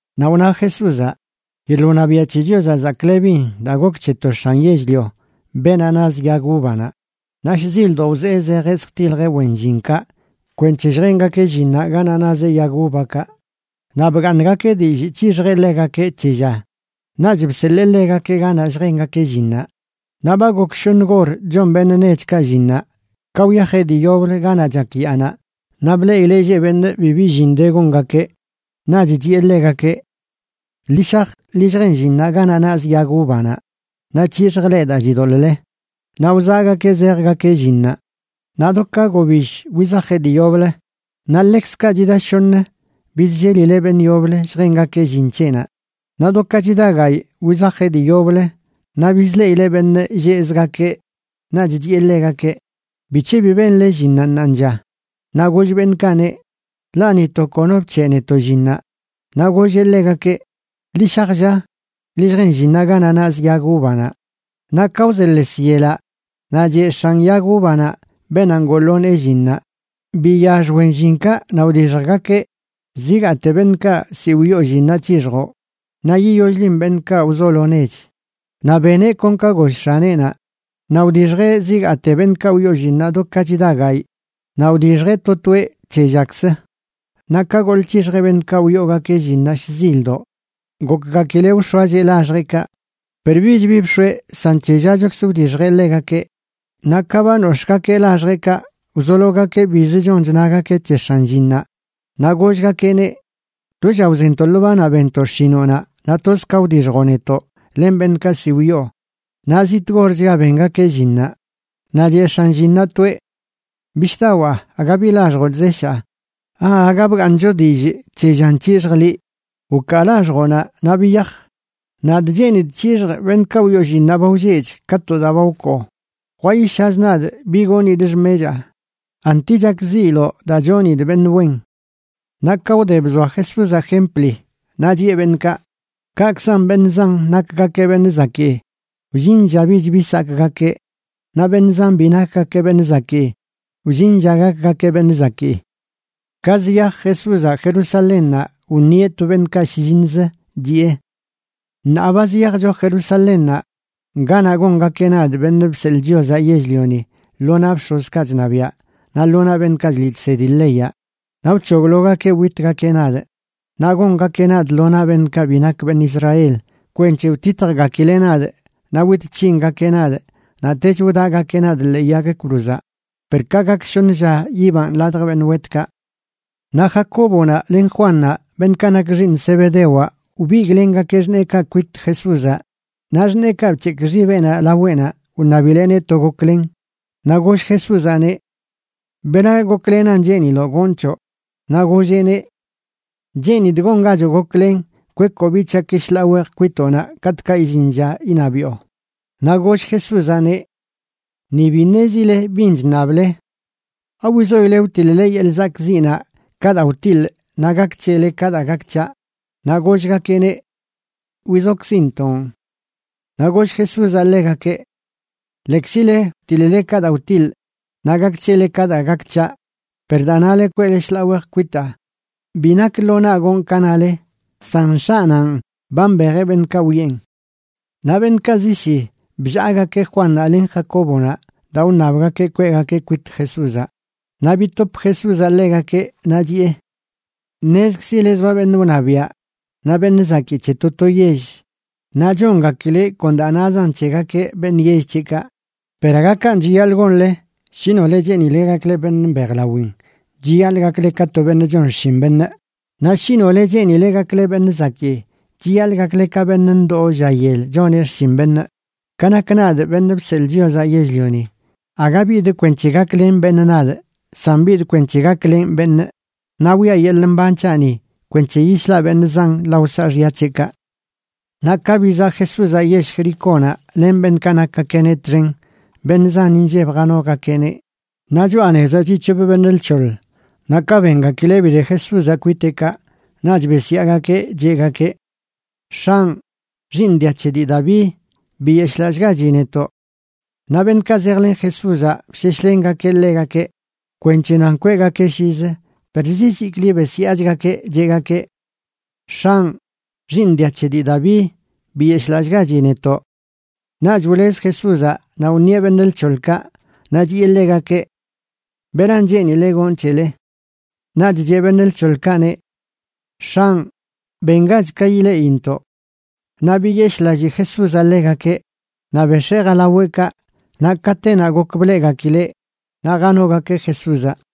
Naꞌ wna Jesúzaꞌ: ―Yeḻꞌ wṉabiaꞌ c̱he Chiozaꞌ chzaklebin daa gok c̱he to x̱an yell-lio beenaꞌ naz yag uvanaꞌ. Naꞌ shzildoꞌ wzee zejeꞌ zjtiljeꞌ wen llinkaꞌ kwenc̱he lljengakeꞌ llinnaꞌ ganaꞌ nazeꞌ yag uvakaꞌ. Naꞌ bgaaṉgakeꞌ dillꞌ c̱hixjeꞌ ḻegakeꞌ c̱he lla, naꞌch bseḻee ḻegakeꞌ ganaꞌ lljengakeꞌ llinnaꞌ. Naꞌ ba gok shoṉ gor chon beṉꞌ nechkaꞌ llinnaꞌ ka wyajeꞌ dii yoblə ganaꞌ chak yaanaꞌ, naꞌ bleꞌileꞌ lleꞌ beṉꞌ bibi llin de gongakeꞌ. Naꞌch chiꞌe ḻegakeꞌ: “Ḻi shaj ḻi lljen llinnaꞌ ganaꞌ nazꞌ yag uvanaꞌ naꞌ c̱hixjꞌ leꞌ daa chidoḻꞌle.” Naꞌ wzaꞌgakeꞌ zejgakeꞌ llinnaꞌ. Naꞌ do ka gobill wizajeꞌ dii yoblə, naꞌ ḻekzkaꞌ chida shoṉə, bizllelileꞌ beṉꞌ yoblə lljengakeꞌ llin c̱heꞌnaꞌ. Naꞌ do ka chida gayꞌ, wizajeꞌ dii yoblə naꞌ bizleꞌileꞌ beṉꞌ lleꞌzgakeꞌ. Naꞌch chiꞌe ḻegakeꞌ: “¿Bic̱he bi benle llinnaꞌ ṉaanlla?” Naꞌ goll beṉꞌkaꞌneꞌ: “Ḻaꞌ ni to kono bc̱heꞌ netoꞌ llinnaꞌ.” Naꞌ golleꞌ ḻegakeꞌ: “Ḻi shaj, lla, ḻi lljen llinnaꞌ ganaꞌ nazꞌ yag uvanaꞌ.” Naꞌ ka wzeḻes yelaꞌ naꞌ cheꞌ x̱an yag uvanaꞌ beenaꞌ ngoo lo nee llinnaꞌ: “Biyax wen llinkaꞌ naꞌ wdixjgakeꞌ. Zigaate beṉꞌkaꞌ ziꞌ wyoo llinnaꞌ c̱hixjoꞌ, naꞌ yiyoll-lin beṉꞌkaꞌ wzolo nech.” Naꞌ beneꞌ kon ka goll x̱aneꞌnaꞌ, naꞌ wdixjeꞌ zigaate beṉꞌkaꞌ wyoo llinnaꞌ do ka chida gayꞌ. Naꞌ wdixjeꞌ to toeꞌ c̱he llakzə. Naꞌ ka goḻꞌ c̱hixjeꞌ beṉꞌkaꞌ wyoogakeꞌ llinnaꞌ shzildoꞌ, gokgakileꞌ wx̱oacheꞌ laxjeꞌkaꞌ. Per bich bi bx̱oeꞌ san c̱he llachokzə wdixjeꞌ ḻegakeꞌ. Naꞌ ka ba nox̱ꞌgakeꞌ laxjeꞌkaꞌ, wzologakeꞌ biz chon chnagakeꞌ c̱he x̱an llinnaꞌ, naꞌ gollgakeꞌneꞌ: “Do lla wzentoꞌ lo banaꞌ benntoꞌ xshinoꞌnaꞌ naꞌ toz ka wdixjoꞌ netoꞌ len beṉꞌkaꞌ ziꞌ wyoo, naꞌ ziꞌ tgorchga bengakeꞌ llinnaꞌ.” Naꞌ cheꞌ x̱an llinnaꞌ toeꞌ: “Bishꞌdawaa, aga bi laxjoꞌ chzeshaa. ¿Aaga bgaaṉcho dillꞌ c̱he llan c̱hixjꞌ liꞌ? Wkaa laxjoꞌnaꞌ, naꞌ biyaj. Nadꞌ cheenidꞌ c̱hixjꞌ beṉꞌkaꞌ wyoo llinnaꞌ ba wlleꞌch ka to daa ba wkoo. Jwayishaz nadꞌ bi gonidꞌ xmechaa. ¿Anti chakziiloꞌ daa chonidꞌ beṉꞌ wen?” Naꞌ ka wde bzoa Jesúzaꞌ jempli, naꞌ chiꞌe beṉꞌkaꞌ: ―Kaꞌkzan beṉꞌ zan nakgakeꞌ beṉꞌ zakii, wllin lla bich bi sakꞌgakeꞌ, naꞌ beṉꞌ zan bi nakgakeꞌ beṉꞌ zakii, wllin lla gakgakeꞌ beṉꞌ zakii. Ka ziyaj Jesúzaꞌ Jerusalénnaꞌ wṉieꞌ to beṉꞌkaꞌ shlliṉzə, chiꞌe: ―Ṉaa ba ziyajcho Jerusalénnaꞌ, ganaꞌ gongakeꞌ nadꞌ, Beṉꞌ Bseḻꞌ Chiozaꞌ yell-lioni, lo naꞌ bx̱ozkaꞌ chṉabiaꞌ naꞌ lo naꞌ beṉꞌkaꞌ chliꞌ chsedi leyaꞌ, naꞌ wc̱hoglogakeꞌ witgakeꞌ nadꞌ. Naꞌ gongakeꞌ nadꞌ lo naꞌ beṉꞌkaꞌ bi nak beṉꞌ Israel kwenc̱he wtitjgakileꞌ nadꞌ naꞌ wit c̱hingakeꞌ nadꞌ, naꞌtech wdaꞌgakeꞌ nadꞌ ḻee yag cruzaꞌ, per ka gak shoṉ lla yibanꞌ ladj beṉꞌ wetkaꞌ. Naꞌ Jacóbonaꞌ len Juannaꞌ, beṉꞌkaꞌ nak xiiṉ Zebedewaꞌ, wbigꞌlengakeꞌ xṉeekaꞌ kwit Jesúzaꞌ, naꞌ xṉeekaꞌ bc̱hekꞌ xibeꞌnaꞌ laweꞌnaꞌ wṉabileꞌneꞌ to goklen. Naꞌ goll Jesúzaꞌneꞌ: ―¿Bera goklenan cheeniloꞌ gonꞌ c̱hoꞌ? Naꞌ golleꞌneꞌ: ―Cheenidꞌ gongachoꞌ goklen kwekoꞌ biꞌ c̱haꞌki shḻaa wej kwitoꞌnaꞌ katꞌkaꞌ illin lla iṉabiꞌo. Naꞌ goll Jesúzaꞌneꞌ: ―Ni bi ṉezile bin chṉable. ¿Awizoile wtiḻ-le yeḻꞌ zakꞌziꞌnaꞌ ka daa wtiḻꞌ naꞌ gak c̱hele ka daa gak c̱haꞌ? Naꞌ gollgakeꞌneꞌ: ―Wizokzintoꞌn. Naꞌ goll Jesúzaꞌ ḻegakeꞌ: ―Lekzile wtiḻ-le ka daa wtiḻꞌ, naꞌ gak c̱hele ka daa gak c̱haꞌ, per daa nale kweꞌle shḻaa wej kwitaa bi nak lo naꞌ gonꞌ ka nale, san X̱aꞌnanꞌ ba mbejeꞌ beṉꞌkaꞌ wiꞌen. Naꞌ beṉꞌkaꞌ zi shi, bllaagakeꞌ Juannaꞌ len Jacóbonaꞌ daa wṉabgakeꞌ kweꞌgakeꞌ kwit Jesúzaꞌ. Naꞌ bitop Jesúzaꞌ ḻegakeꞌ, naꞌ chiꞌe: ―Ṉezkzile zoa beṉꞌ wṉabiaꞌ naꞌ beṉꞌ zakii c̱he to to yell naꞌ chongakileꞌ kon daa nazan c̱hegakeꞌ beṉꞌ yell c̱heꞌkaꞌ. Per aga kanꞌ chiyaḻꞌ gonle. Shi nole cheenile gakle beṉꞌ mbejlawin chiyaḻꞌ gakle ka to beṉꞌ chon xshin beṉꞌ. Naꞌ shi nole cheenile gakle beṉꞌ zakii, chiyaḻꞌ gakle ka beṉꞌ ndoo lla yel choneꞌ xshin beṉꞌ. Ka nak nadꞌ, Beṉꞌ Bseḻꞌ Chiozaꞌ Yell-lioni, aga bidꞌ kwenc̱he gaklen beṉꞌ nadꞌ, san bidꞌ kwenc̱he gaklenꞌ beṉꞌ naꞌ wiꞌa yeḻꞌ mban c̱haꞌni kwenc̱he yislaꞌ beṉꞌ zan lao saaxya c̱heꞌkaꞌ. Naꞌ ka bizaꞌ Jesúzaꞌ yell Jericónaꞌ len beṉꞌkaꞌ nakgakeꞌneꞌ txen, beṉꞌ zan inlleb janogakeꞌneꞌ. Naꞌ choꞌa nezaꞌ chiꞌ c̱hop beṉꞌ lc̱hoḻ, naꞌ ka bengakileꞌ bide Jesúzaꞌ kwiteꞌkaꞌ naꞌch besyaagakeꞌ, cheꞌgakeꞌ: ―¡X̱anꞌ, xiiṉ dia c̱he dii Daví, biyeshꞌlallꞌgachi netoꞌ! Naꞌ beṉꞌkaꞌ zejlen Jesúzaꞌ bsheshlengakeꞌ ḻegakeꞌ kwenc̱he nan kweꞌgakeꞌ lliz, per ziziklə besyaachgakeꞌ, cheꞌgakeꞌ: ―¡X̱anꞌ, xiiṉ dia c̱he dii Daví, biyeshꞌlallꞌgachi netoꞌ! Naꞌch wlez Jesúzaꞌ naꞌ wṉieꞌ beṉꞌ lc̱hoḻkaꞌ, naꞌ chiꞌe ḻegakeꞌ: ―¿Beran cheenile gonꞌ c̱hele? Naꞌch cheꞌ beṉꞌ lc̱hoḻkaꞌneꞌ: ―X̱anꞌ, bengach ka ileꞌintoꞌ. Naꞌ biyeshꞌlallii Jesúzaꞌ ḻegakeꞌ naꞌ bex̱ee jalaweꞌkaꞌ. Naꞌ katenaꞌ gok bleꞌgakileꞌ naꞌ janogakeꞌ Jesúzaꞌ.